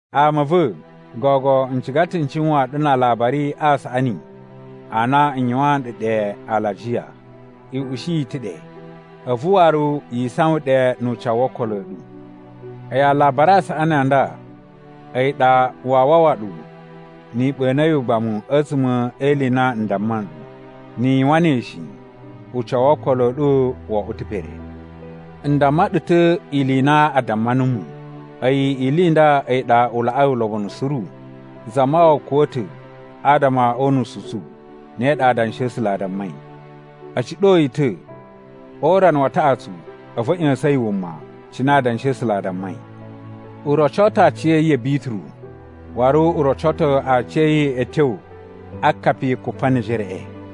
Ama a̱ va̱, gogo n ciga ta̱ n cuwaan ɗu na Alabari a Saꞌani a na n yuwaan ɗu ɗe alajiya. I ushi yi ta̱ ɗe, a̱vu waru yi isawan ɗe nu ucawu wo okolo a̱ ɗu. A̱yi Alabari a Saꞌani a nda a̱yi ɗa waa wawa ɗu ni i ɓa̱na̱ yi ugbamu a̱tsuma̱ e ili i na n damma nɗu. Ni i yuwan ne shi, ucawu wo okolo a̱ ɗu wo oꞌwo ta̱ pere. N damma ɗu ta̱ ili i na a damma numu. A̱yi ili i nda a̱yi ɗa u laꞌai ulobonu suru: Zamawawa kuwa̱ ta̱ adama o unusu u tsu, ne ɗa Adanshi a̱ A̱sula̱ a dammai. A̱ ciɗo yi ta̱, o urana wa taꞌatsu a̱vu a̱ ꞌya̱sa̱n yi wuma, cine Adanshi a̱ A̱sula̱ a dammai. U roco ta̱ aciya̱yi ya̱ Bituru, waru u roco ta̱ aciya̱yi a̱ tyo a akapi Kupanejereꞌe.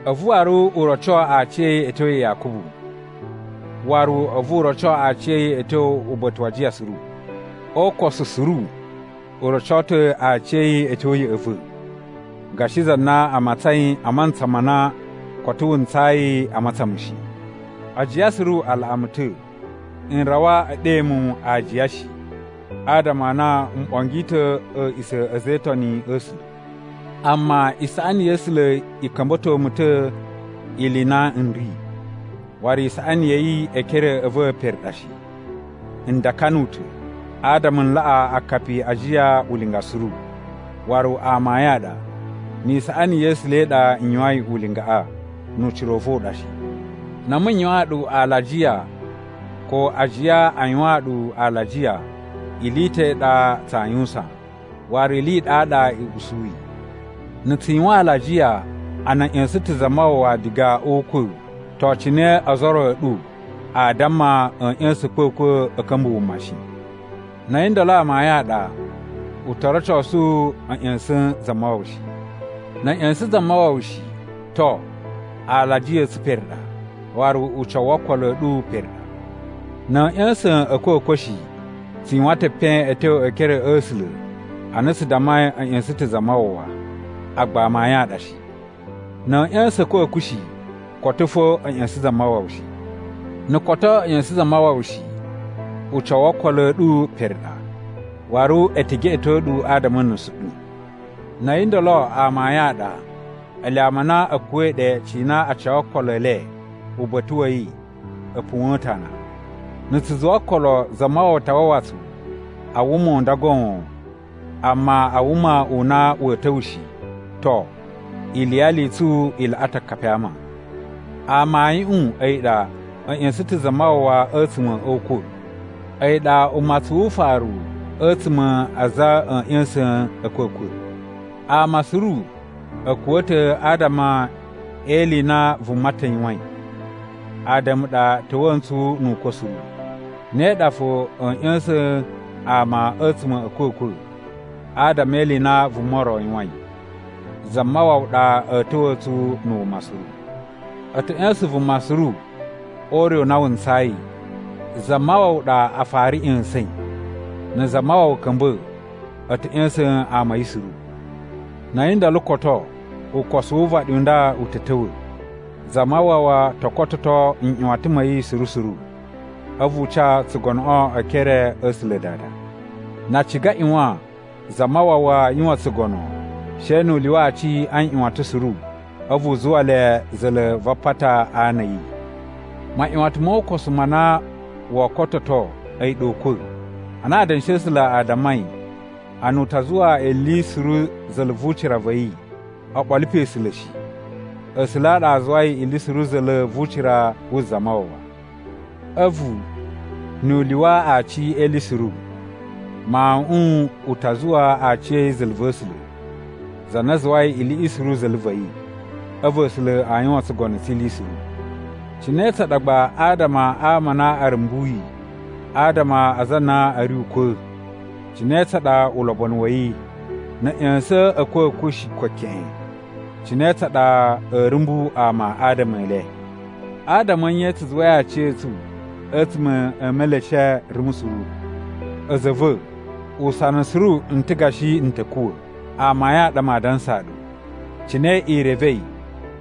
A̱vu waru u roco aciya̱yi a̱ tyo ya Yakubu, waru a̱vu u roco aciya̱yi a̱ tyo uba̱ta̱ wa ajiya suru. O ukosu suru, u roco ta̱ aciya̱yi a̱ tyo ya̱ꞌa̱ va̱, gashi za na a matsain a mantsa ma na koto wu ntsayi a matsan mu shi. Ajiya suru a laꞌa mu ta̱. N rawa e ɗe mu aajiya shi, adama a na m ɓongi ta̱ a̱a̱ꞌisa̱ a̱ a̱za̱ e Itoni a̱ A̱sula̱. Amma isaꞌani ya̱ A̱sula̱ i ka̱mba̱to mu ta̱ ili i na n ri, waru isaꞌani ya̱ yi e ekere a̱ va̱ pere ɗa shi. N dakanu ta̱ adama n laꞌa akapi a ajiya ulinga suru, waru amayun a ɗa, ni isaꞌani ya̱ A̱sula̱ i ɗa n yuwain ulingaꞌa, nu ucira u va̱ u ɗa shi. Na̱ a̱mu n yuwaan ɗu alajiya ko ajiya a yuwaan ɗu alajiya, ili i ta̱ i ɗa tsaa yuwusan, waru iliꞌi i ɗaɗa i usuyi. Na̱ tsu yuwan alajiya a na a̱ ꞌya̱sa̱n ta̱ Zamawawa diga o ukwa̱, to cine ozo o ro a̱ ɗu aa damma a̱a̱ ꞌya̱sa̱n a̱kwa̱kwa̱ a̱ ka̱mba̱ wuma shi? Na̱ a̱yi ndolo amayun a ɗa, u to rocosu a̱ ꞌya̱sa̱n Zamawawa shi. Na̱ a̱ ꞌya̱sa̱n Zamawawa shi, to, alajiya a̱ tsu pere ɗa, waru ucawu wo okolo a̱ ɗu pere ɗa. Na̱ a̱a̱ ꞌya̱sa̱n a̱kwa̱kwa̱ shi, tsu yuwan ta̱ epen a̱ tyo e ekere a̱ A̱sula̱ ana tsu dammai a̱ ꞌya̱sa̱n ta̱ Zamawawa, agba amayun a ɗa shi. Na̱ a̱a̱ ꞌya̱sa̱n a̱kwa̱kwa̱ shi, koto fo a̱ ꞌya̱sa̱n Zamawawa shi. Na̱ koto a̱ ꞌya̱sa̱n Zamawawa shi, ucawu wo okolo a̱ ɗu pere ɗa, waru e te geꞌeto ɗu adama a̱ nusu ɗu. Na̱ a̱yi ndolo amayun a ɗa, ele ama a na a̱ kuwa̱i ɗe cina a ca okolo e le uba̱ta̱ wa̱ yi a̱ puwa̱n ta̱ ana. Na̱ tsu zuwa okolo Zamawawa ta wawa tsu a wuma u nda goon amma a wuma u na wa̱a̱ ta̱wa̱ shi, to, iliyali i tsu i laꞌa ta̱ akapi a ama. Amayuꞌun a̱yi ɗa a̱ ꞌya̱sa̱n ta̱ Zamawawa a̱tsuma̱ o ukwa̱, a̱yi ɗa umatsun wu ufaru a̱tsuma̱ a aza a̱a̱ ꞌya̱sa̱n a̱ a̱kwa̱kwa̱. Ama suru a̱ kuwa̱ ta̱ adama e ili i na vuma ta̱ yuwain, Ada̱mu ɗa ta̱wa̱a̱ ntsu nu ukwa̱ suru. Ne ɗa fo a̱a̱ ꞌya̱sa̱n ama a̱tsuma̱ a̱ a̱kwa̱kwa̱ adama e ili i na vuma ro yuwain. Zamawawa ɗa a̱a̱ ta̱wa̱a̱ tsu na̱ wuma suru. A̱ ta̱ ꞌya̱sa̱n vuma suru o ure u na wu ntsayi. Zamawawa ɗa a fara ꞌya̱sa̱in. Na̱ Zamawawa ka̱mba̱, a̱ ta̱ ꞌya̱sa̱n ama a̱ yi suru. Na̱ a̱yi ndolo koto, ukosu wu uvaɗi u nda u ta̱ ta̱wa̱. Zamawawa to kototo nꞌyuwatan ma̱ yi suru suru, a̱vu u ca tsugonoꞌo e ekere a̱ A̱sula̱ Dada. Na a ciga a ꞌyuwan Zamawawa yuwan tsugono she nu u lyuwa aci a nꞌyuwatan suru a̱vu u zuwa le za̱la̱ va apata a ana a̱ yi. Maꞌyuwatan mo ukosu ma na woo kototo a̱yi ɗa ukwa̱. Ana Adanshi a̱ A̱sula̱ a dammai a na u ta zuwa ili suru za̱la̱ vu ucira va̱ yi, o ɓolo pe A̱sula̱ shi. A̱sula̱ a ɗa a zuwai ili suru za̱la̱ vu ucira wu Zamawawa. A̱vu, nu u lyuwa aci e ili suru, Mawuꞌun u ta zuwa aciya̱yi za̱la̱ va̱ A̱sula̱, za na zuwai iliꞌi suru za̱la̱ va̱ yi. A̱vu A̱sula̱ a yuwan tsugono tsi ili suru. Cine tsa ɗa gba adama a ama a na a̱ rumbuyi adama a aza a na a̱ ri ukwa̱? Cine tsa ɗa ulobonu wa̱ yi? Na̱ a̱ ꞌya̱sa̱n a̱kwa̱kwa̱ shi ko keꞌen, cine tsa ɗa a̱a̱ rumbu ama adama e le? Adama a̱ nye tsu zuwai aciya̱tsu a̱tsuma̱ e meleshe rumu suru? A̱za̱ a̱ va̱, usana suru n ta gashi n ta̱ kuwa̱. Amayun a ɗa maa dansaa ɗu. Cine i revei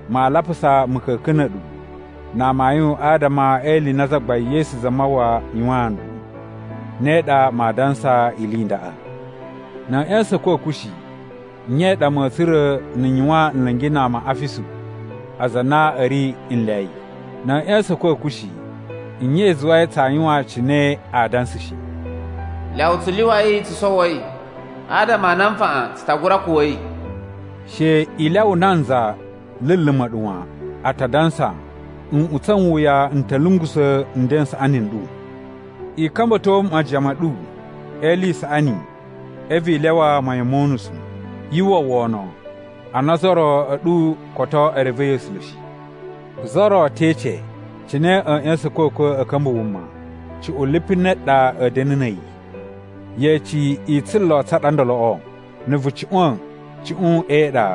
maa lapusa ma̱ka̱ka̱n na̱ a̱ɗu na amayun adama e ili i na Zagbain Yesu Zamawawa yuwaan nɗu, ne ɗa maa dansa ili i ndaꞌa. Na̱ a̱ ꞌya̱sa̱n a̱kwa̱kwa̱ shi, nye i ɗa ma̱a̱ tsura̱ na̱ n yuwan nla̱ngi na ama a Afisu aza a na a̱ ri nlyayi? Na̱ a̱ ꞌya̱sa̱n a̱kwa̱kwa̱ shi nye i zuwai tsaa yuwan cine a dansa shi? “Lyawa tsu lyuwai tsu sowoi, adama a na nfaꞌan tsu ta gura kuwa̱i.” She i lyawa nanza luluma̱ ɗu wan. A ta dansa, “Nꞌutsa̱ n wuya n ta̱ lungusa̱ nden n saꞌani n ɗu.” I ka̱mba̱to majiyan ma̱ ɗu e ili i saꞌani a̱vu i lyawa mayan mo unusu. Yu uwwa wono a na ozo o ro a̱ ɗu koto e revei A̱sula̱ shi. Za ro te ece, “Cine a̱a̱ ꞌya̱sa̱n a̱kwa̱kwa̱ a̱ ka̱mba̱ wuma? Cuꞌun lipu ne ɗa a̱a̱ da̱na̱ na̱ a̱yi?” Yeci i tsulo tsa ɗa ndoloꞌo. Na̱ vu cuꞌwa̱n cuꞌun e iɗa,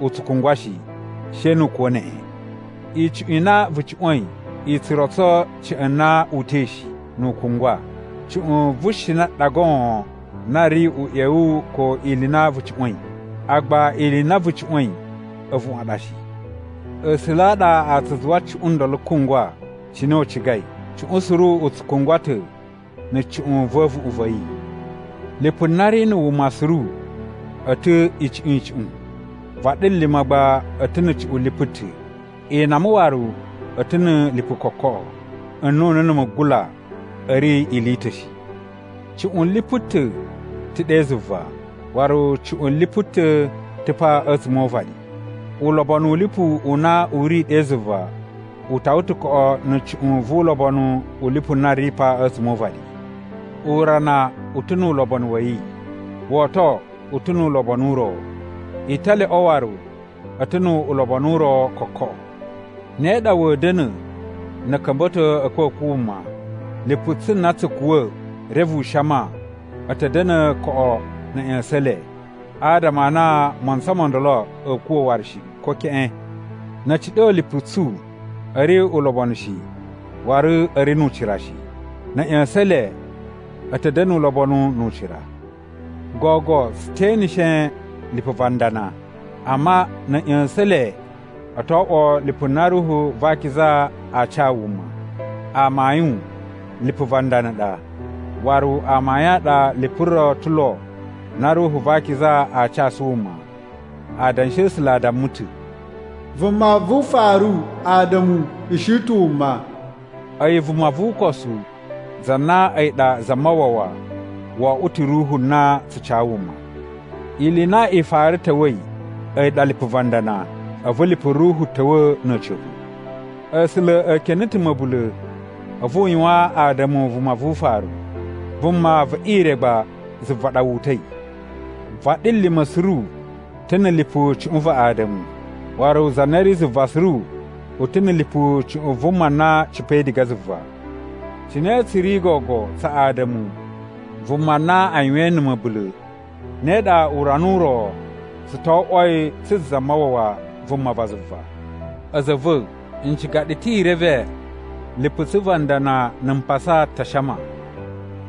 u tsu kungwa shi, she nu u kuwa̱ neꞌen. Icuꞌun i na vu cuꞌwa̱in i tsu rotso ca̱ꞌa̱n na uta̱i shi, nu u kungwa. Cuꞌun vu shina ɗa goon na ri uꞌyewu ko ili i na vu cuꞌwa̱in, agba ili i na vu cuꞌwa̱in a̱vuꞌun a ɗa shi. A̱sula̱ a ɗa a tsu zuwa cuꞌun ndolo kungwa cine u cigai, cuꞌun suru u tsu kungwa ta̱ na̱ cuꞌun va̱ a̱vuꞌun va̱ yi. Lipu na ri na̱ wuma suru a̱ ta̱ icuꞌun icuꞌun. Vaɗilima̱ gba a̱ ta̱ na̱ cuꞌun lipu ta̱. Inama waru a̱ ta̱ na̱ lipu kokoꞌo. Nnunu na̱ mugula a̱ ri ili i ta̱ shi. Cuꞌun lipu ta̱, ta̱ ɗe zuva, waru cuꞌun lipu ta̱, ta̱ pa a̱tsuma̱ o uvaɗi. Ulobonu u lipu u na u ri ɗe zuva u tawa ta̱ koꞌo na̱ cuꞌun vu ulobonu u lipu na ri pa a̱tsuma̱ o uvaɗi. Urana u ta̱ nu ulobonu wa̱ yi, woto u ta̱ nu ulobonu u ro. Italyoꞌo waru a̱ ta̱ nu ulobonu u ro kokoꞌo. Ne ɗa wa̱a̱ da̱na̱ na̱ a̱ ka̱mba̱to a̱kwa̱kwa̱ wuma. Lipu tsu na tsu kuwa̱ reve u shama, a̱ ta̱ da̱na̱ koꞌo na̱ a̱ ꞌya̱sa̱n le, adama a na a mantsa mo ndolo a̱a̱ kuwa̱ waru shi ko keꞌen. Na̱ a̱ ciɗo lipu tsu, a̱ ri ulobonu shi waru a̱ ri nu ucira shi. Na̱ a̱ ꞌya̱sa̱n le, a̱ ta̱ da̱na̱ ulobonu nu ucira. Gogo tsu te eneshe lipu va ndana, amma na̱ a̱ ꞌya̱sa̱n le, o to oꞌwo lipu na Ruhu va Akiza aa ca wuma. Amayun lipu va ndana ɗa, waru amayun a ɗa lipu ro ta̱ lo na Ruhu va Akiza aa casu wuma. Adanshi a̱ A̱sula̱ a damma ta̱, “Vuma vu ufaru Ada̱mu ushi ta̱ wuma.” A̱yi vuma vu ukosu, za na a̱yi ɗa Zamawawa, wo oꞌwo ta̱ ruhu na tsu ca wuma. Ili i na i fara ta̱wa̱i a̱yi ɗa lipu va ndana, a̱vu lipu ruhu ta̱wa̱ na̱ a̱ca̱pa̱. A̱sula̱ e kene ta̱ ma̱bula̱ a̱vu u yuwan Ada̱mu vuma vu ufaru. Vuma ve ire gba zuva ɗa wu uta̱i. Vaɗilima̱ suru ta̱ na̱ lipu cuꞌun va Ada̱mu. Waru za na ri zuva suru u ta̱ na̱ lipu cuꞌun vuma na cipa̱i diga zuva. Cine tsu ri gogo tsa Ada̱mu, vuma na a yuwain na̱ ma̱bula̱, ne ɗa urana u ro tsu to oꞌwoi tsu Zamawawa, vuma va zuva. A̱za̱ a̱ va̱, n ciga ɗu ta̱ i reve lipu tsu va ndana na̱ mpasa ta shama.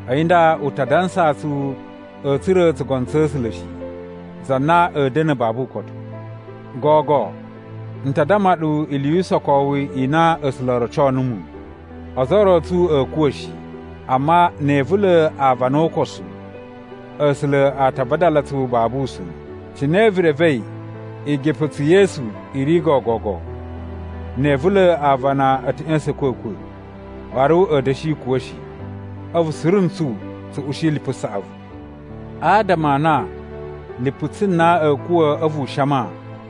A̱yi nda u ta dansaa tsu a̱a̱ tsura̱ tsugono tsa̱ A̱sula̱ shi, za na a̱a̱ da̱na̱ babu ukotu. Gogo n ta damma ɗu ili yu usokowu i na A̱sula̱ o roco numu: Ozo o ro a̱ tsu a̱a̱ kuwa̱ shi, amma ne e ivula̱ aavana o ukosu, A̱sula̱ a ta vadala tsu babu usa̱n, cine vu revei igipa̱tsu ye esu i ri gogogo. Ne e ivula̱ aavana, a̱ ta̱ ꞌya̱sa̱n a̱kwa̱kwa̱, waru a̱a̱ da̱shi kuwa̱ shi, a̱vu suru ntsu tsu ushi lipu saꞌavu. Adama a na lipu tsu na a̱a̱ kuwa̱ a̱vu u shama,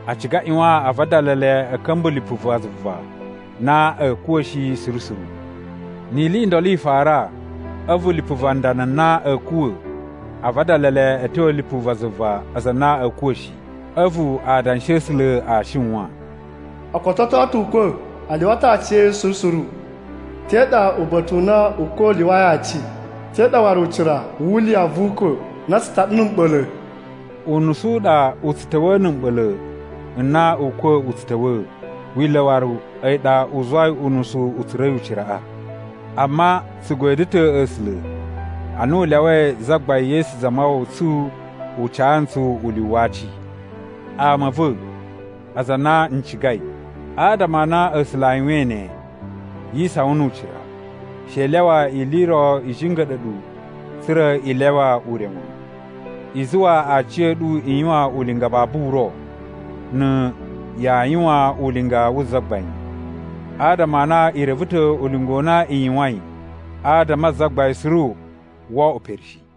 a ciga a ꞌyuwan a vadala le a̱ ka̱mba̱ lipu va zuva na a̱a̱ kuwa̱ shi suru suru. Ni ili i ndolo i fara, a̱vu lipu va ndana na a̱a̱ kuwa̱ a vadala le a̱ tyo a̱ lipu va zuva aza a na a̱a̱ kuwa̱ shi, a̱vu Adanshi a̱ A̱sula̱ a shiwan: “O kototo ta̱ ukwa̱, a lyuwa ta̱ aci a̱ yi suru suru! Te ɗa uba̱ta̱ u na ukwa̱ u lyuwai aci? Te ɗa waru ucira wu liya vu ukwa̱ na tsu taɗa na̱ mɓa̱la̱?” Unusu u ɗa u tsu ta̱wa̱a̱ na̱ mɓa̱la̱ n na ukwa̱ u tsu ta̱wa̱a̱. Wila̱ waru a̱yi ɗa u zuwai unusu u tsura̱i uciraꞌa. Amma tsu godyo ta̱ A̱sula̱ ana u lyawai Zagbain Yesu Zamawawa tsu u ca ntsu ulyuwu wa aci! Ama a̱ va̱, aza a na n cigai, adama a na A̱sula̱ a yuwain ne, yi isawan nu ucira. She i lyawa ili i ro i jinga̱ɗa̱ ɗu tsa̱ra̱ i lyawa ure wan. I zuwa aciya̱ɗu i yuwan ulinga babu uro na̱ yaa yuwan ulinga wu Zagbain, adama a na i reve ta̱ ulinga u na i yuwain adama a Zagbain suru woo oꞌwo pere shi.